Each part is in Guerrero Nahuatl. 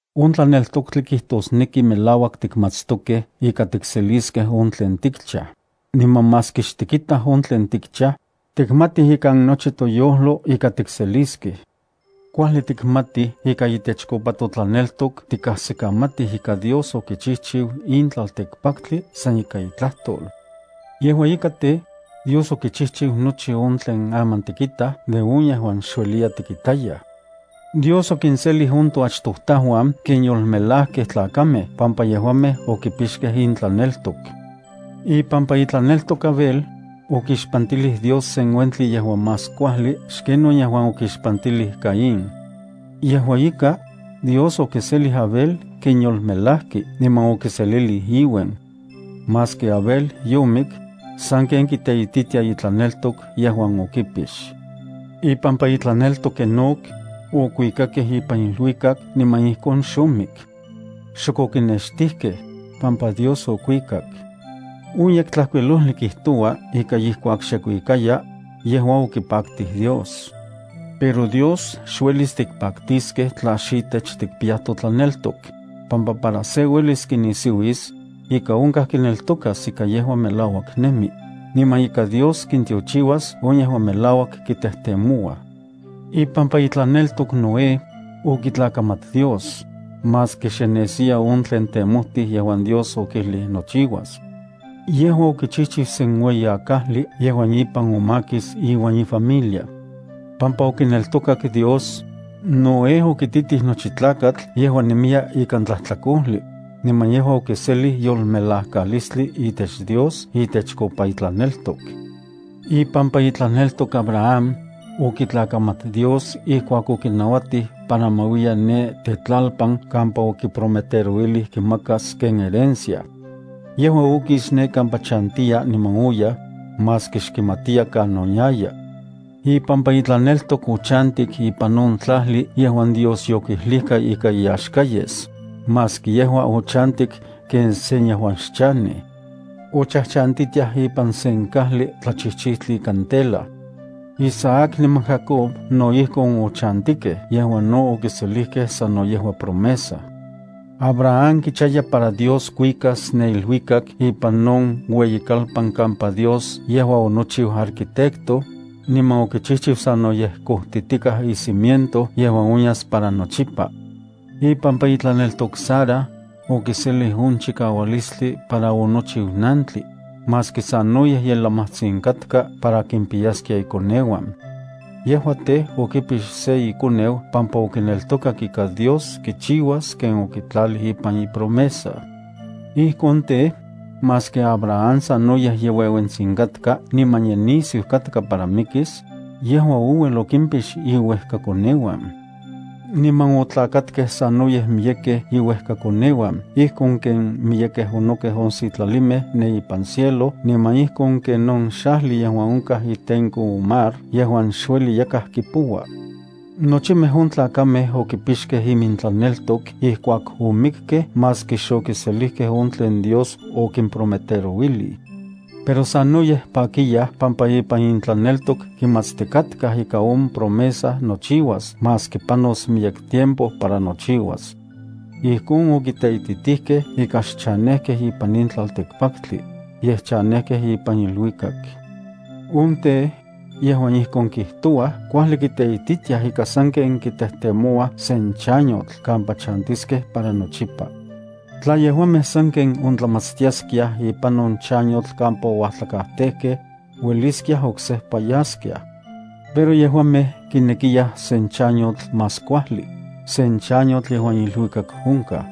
On tlaneltoktli kijtosneki melauak tikmatstokej ika tikseliskej on tlen tikchaj, niman maski xtikitaj on tlen tikchaj, tikmatij ikan nochi toyojlo ika tikseliskej. Kuajli tikmatij ika itechkopa totlaneltok tikajsikamatij ika Dios okichijchiu in tlaltikpaktli san ika itlajtol. Yejua ika tej, Dios okichijchiu nochi on tlen aman tikitaj de on yejuan xueliya tikitayaj. Dios okinselij on toachtojtajuan ken yolmelajkej tlakamej pampa yejuamej okipixkej intlaneltok. Ipampa itlaneltok Abel, okixpantilij Dios sen uentli yejuan más kuajli xken on yejuan okixpantilij Caín. Yejua ika, Dios okiselij Abel ken yolmelajki niman okiselilij iuen. Maski Abel yomik, sanken kiteititia itlaneltok yejuan okipix. Ipampa itlaneltok Enoc, okuikakej ipan iluikak niman ijkon xomik. Xok okinextijkej, pampa Dios okuikak. On Yektlajkuilojli kijtoua ika ijkuak xe kuikayaj, yejua okipaktij Dios. Pero Dios xuelis tikpaktiskej tla xitech tikpiyaj totlaneltok, pampa para se uelis kinisiuis, ika onkaj kineltokas ika yejua melauak nemi, niman ika Dios kintiochiuas on yejuan melauak kitejtemouaj. Ipampa itlaneltok Noé, okitlakamat Dios, maski xe nesiya on tlen temojtij yejuan Dios okijlij nochiuas. Yejua okichijchiu sen ueyi akajli yejuan ipan omakis iuan ifamilia. Pampa okineltokak Dios, Noé okititij nochi tlakatl yejuan nemiya ikan tlajtlakojli, niman yejua okiselij yolmelajkalistli itech Dios itechkopa itlaneltok. Ipampa itlaneltok Abraham, okitlakamat Dios ijkuak okinauatij para ma uiya ne tetlalpan kampa okiprometerouilij kimakas ken herencia. Yejua okis ne kampa chantiya niman oyaj, maski xkimatiya kanon yaya. Ipampa itlaneltok ochantik ipan on tlajli yejuan Dios yokijlijka ika iyaxka yes, maski yejua ochantik ken sen yejuan xchanej. Ochajchantitiaj ipan sen kajli tlachijchijtli ikan tela. Isaac niman Jacob no ijkon ochantikej yejuan no okiselijkej sano yejua promesa. Abraham kichaya para Dios kuikas ne iluikak ipan on ueyikalpan kampa Dios yejua onochiu arquitecto, niman okichijchiu sanoyej kojtitikaj icimiento yejuan onyas para nochipa. Ipampa itlaneltok Sara, okiselij on chikaualistli para onochiu nantli, maski sanoyej ye lamajtsin katka para kimpiyaskia ikoneuan. Yejua tej, okipix se ikoneu pampa okineltokak ika Dios kichiuas ken okitlalij ipan ipromesa. Ijkon tej, maski Abraham sanoyej ye ueuentsin katka niman ye nisiu katka para mikis, yejua ouel okimpix iuejkakoneuan. Niman otlakatkej sanoyej miyekej iuejkakoneuan ijkon ken miyekej onokej on sitlalimej ne ipan cielo niman ijkon ken on xajli yejuan onkaj itenko on mar yejuan xueli yakaj kipoua. Nochimej on tlakamej okipixkej imintlaneltok ijkuak omikkej maski xokiselijkej on tlen Dios okimprometerouilij. Pero sanoyej pakiyaj pampa ipan intlaneltok kimatstikatkaj ika on promesa nochiuas maski panos miyek tiempo para nochiuas. Ijkon okiteititikej ika xchanejkej ipan in tlaltikpaktli, yej chanejkej ipan iluikak. On tej, yejuan ijkon kijtouaj kuajli kiteititiaj ika sanken kitejtemouaj sen chanyotl kampa chantiskej para nochipa. Tla yejuamej sanken ontlamatstiaskiaj ipan on chanyotl kampa ouajtlakajtejkej, ueliskiaj oksejpa yaskiaj. Pero yejuamej kinekiyaj sen chanyotl más kuajli, sen chanyotl yejuan iluikak onkaj.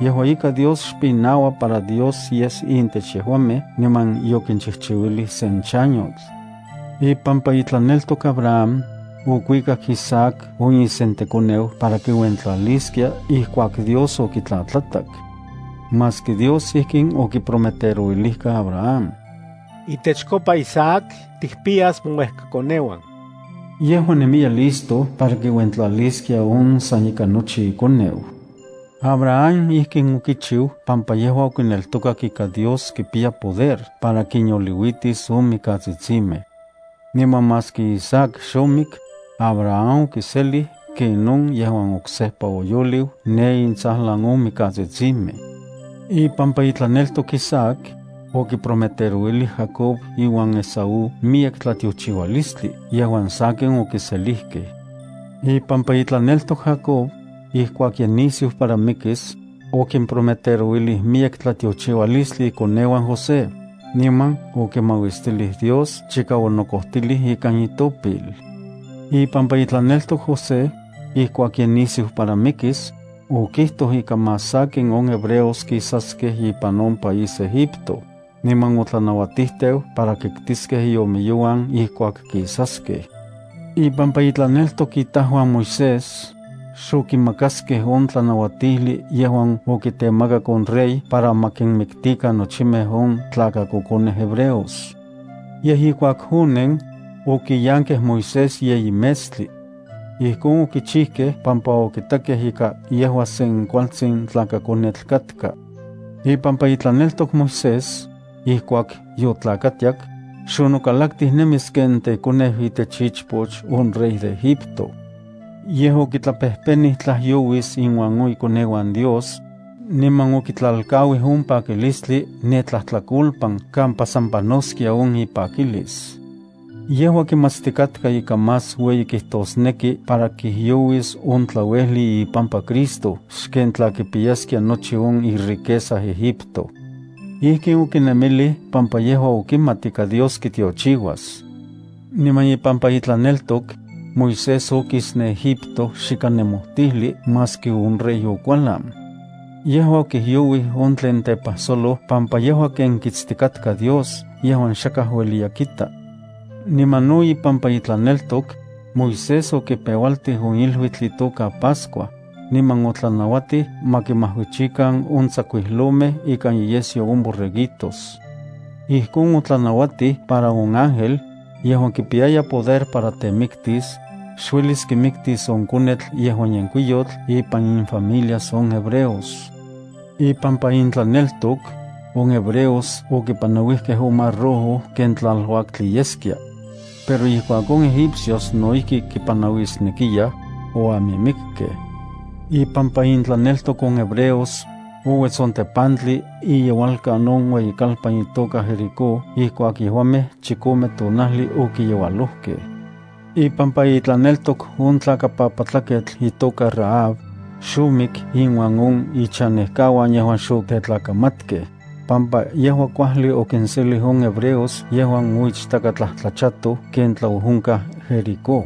Yejua ika, Dios xpinaua para Dios yes intech yejuamej niman yokinchijchiuilij sen chanyotl. Ipampa itlaneltok Abraham, okuikak Isaac on isentekoneu para kiuentlaliskia ijkuak Dios okitlatlatak. Maski Dios ijkin okiprometerouilijka Abraham: “Itechkopa Isaac tikpiyas mouejkakoneuan”, yejua nemiya listo para kiuentlaliskia on san ika nochi ikoneu. Abraham ijkin okichiu pampa yejua okineltokak ika Dios kipiya poder para kinyoliuitis on mikatsitsimej. Niman maski Isaac xomik, Abraham okiselij ken on yejuan oksejpa oyoliu ne intsajlan on mikatsitsimej. Ipampa itlaneltok Isaac, okiprometerouilij Jacob iuan Esaú miyek tlatiochiualistli yejuan sakin okiselijkej. Ipampa itlaneltok Jacob, ijkuak ye nisiu para mikis, okimprometerouilij miyek tlatiochiualistli ikoneuan José, niman okimauistilij Dios chika onokojtilij ikan itopil. Ipampa itlaneltok José, ijkuak ye nisiu para mikis, okijtoj ika más sakin on hebreos kisaskej ipan on país Egipto, niman otlanauatijteu para kiktiskej iomiyouan ijkuak kisaskej. Ipampa intlaneltok itajuan Moisés, xokimakaskej on tlanauatijli yejuan okitemakak on rey para ma kinmiktikan nochimej on tlakakokonej hebreos. Yej, ijkuak onen, okiyankej Moisés yeyi metstli. Ijkon okichijkej pampa okitakej ika yejua sen kualtsin tlakakonetl katka. Ipampa itlaneltok Moisés, ijkuak yotlakatiak, xonokalaktij nemis ken tekoneu itech ichpoch on rey de Egipto. Yej, okitlapejpenij tlajyouis inuan on ikoneuan Dios, niman okitlalkauij on pakilistli ne tlajtlakolpan kampa san panoskia on ipakilis. Yejua kimatstikatka ika más ueyi kijtosneki para kijyouis on tlauejli ipampa Cristo xken tla kipiyaskia nochi on iriqueza Egipto. Ijkin okinemilij pampa yejua okimat ika Dios kitiochiuas. Niman ipampa itlaneltok, Moisés okis ne Egipto xikan nemojtijli maski on rey okualan. Yejua okijyouij on tlen tepajsoloj pampa yejua ken kitstikatka Dios yejuan xakaj ueliya kita. Niman no ipampa itlaneltok, Moisés okipeualtij on iluitl itoka Pascua, niman otlanauatij ma kimajuichikan on tsakuijlomej ikan inyesyo on borreguitos. Ijkon otlanauatij para on ángel, yejuan kipiyaya poder para temiktis, xuelis kimiktis on konetl yejuan yenkuiyotl ipan infamilias on hebreos. Ipampa intlaneltok, on hebreos okipanauijkej on Mar Rojo ken tlaluaktli yeskia. Pero ijkuak on Egipcios no ijki kipanauisnekiyaj, oamimikkej. Ipampa intlaneltok on hebreos, ouets on tepantli iyeualkan on ueyikalpan itoka Jericó ijkuak yejuamej chikome tonajli okiyeualojkej. Ipampa itlaneltok on tlakapapatlaketl itoka Rahab, xomik inuan on ichanejkauan yejuan xotetlakamatkej, pampa yejua kuajli okinselij on hebreos yejuan oichtakatlajtlachatoj ken tlaojonkaj Jericó.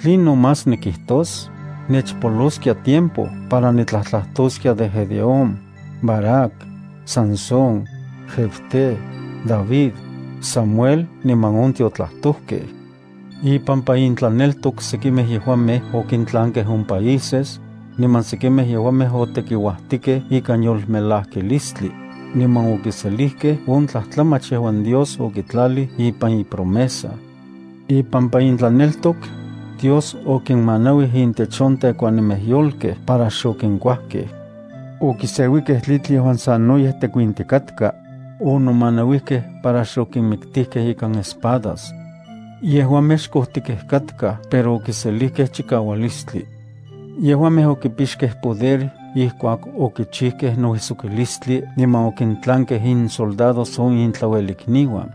¿Tlinon más nikijtos? Nechpoloskia tiempo para nitlajtlajtoskia de Gedeón, Barak, Sansón, Jefté, David, Samuel niman on tiotlajtojkej. Ipampa intlaneltok sekimej yejuamej okintlankej on países, niman sekimej yejuamej otekiuajtikej ikan yolmelajkilistli, niman okiselijkej on tlajtlamach yejuan Dios okitlalij ipan ipromesa. Ipampa intlaneltok, Dios okinmanauij intech on tekuanimej yolkej para xokinkuajkej. Okiseuijkej tlitl yejuan sanoyej tekuintikatka, onomanauijkej para xokinmiktijkej ikan espadas. Yejuamej xkojtikej katkaj pero okiselijkej chikaualistli. Yejuamej okipixkej poder ijkuak okichijkej nouijsokilistli niman okintlankej insoldados on intlauelikniuan.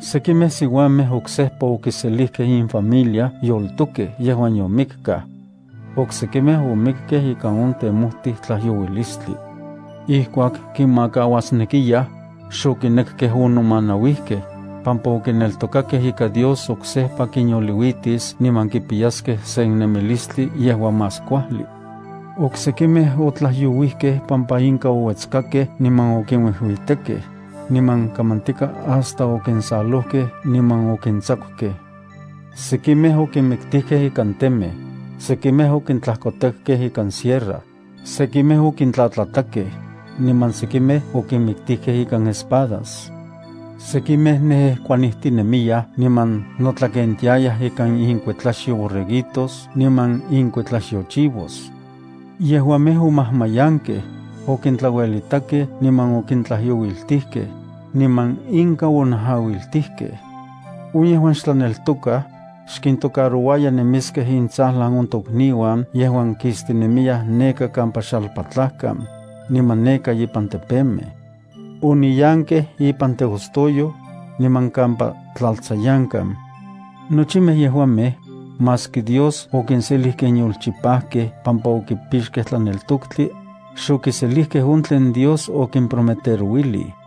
Sekimej siuamej oksejpa okiselijkej infamilia yoltokej yejuan yomikkaj. Oksekimej omikkej ika on temojtij tlajyouilistli. Ijkuak kinmakauasnekiyaj, xokinekkej onomanauijkej, pampa okineltokakej ika Dios oksejpa kinyoliuitis niman kipiyaskej sen nemilistli yejuan más kuajli. Oksekimej otlajyouijkej pampa inka ouetskakej niman okinuijuitekej, niman kamantika hasta okinsalojkej niman okintsakukej. Sekimej okinmiktijkej ikan temej. Sekimej okintlajkotekkej ikan sierra. Sekimej okintlatlatakej, niman sekimej okinmiktijkej ikan espadas. Sekimej nejejkuanijtinemiyaj niman notlakentiayaj ikan inkuetlaxyo borreguitos niman inkuetlaxyo chivos. Yejuamej omajmayankej, okintlauelitakej niman okintlajyouiltijkej, niman inka onajauiltijkej. On yejuan xtlaneltokaj, xkintocarouaya nemiskej intsajlan on tokniuan yejuan kistinemiyaj neka kampa xalpatlajkan, niman neka ipan tepemej. Oniyankej ipan teostoyoj, niman kampa tlaltsayankan. Nochimej yejuamej, maski Dios okinselij ken yolchipajkej pampa okipixkej tlaneltoktli, xokiselijkej on tlen Dios okimprometerouilij,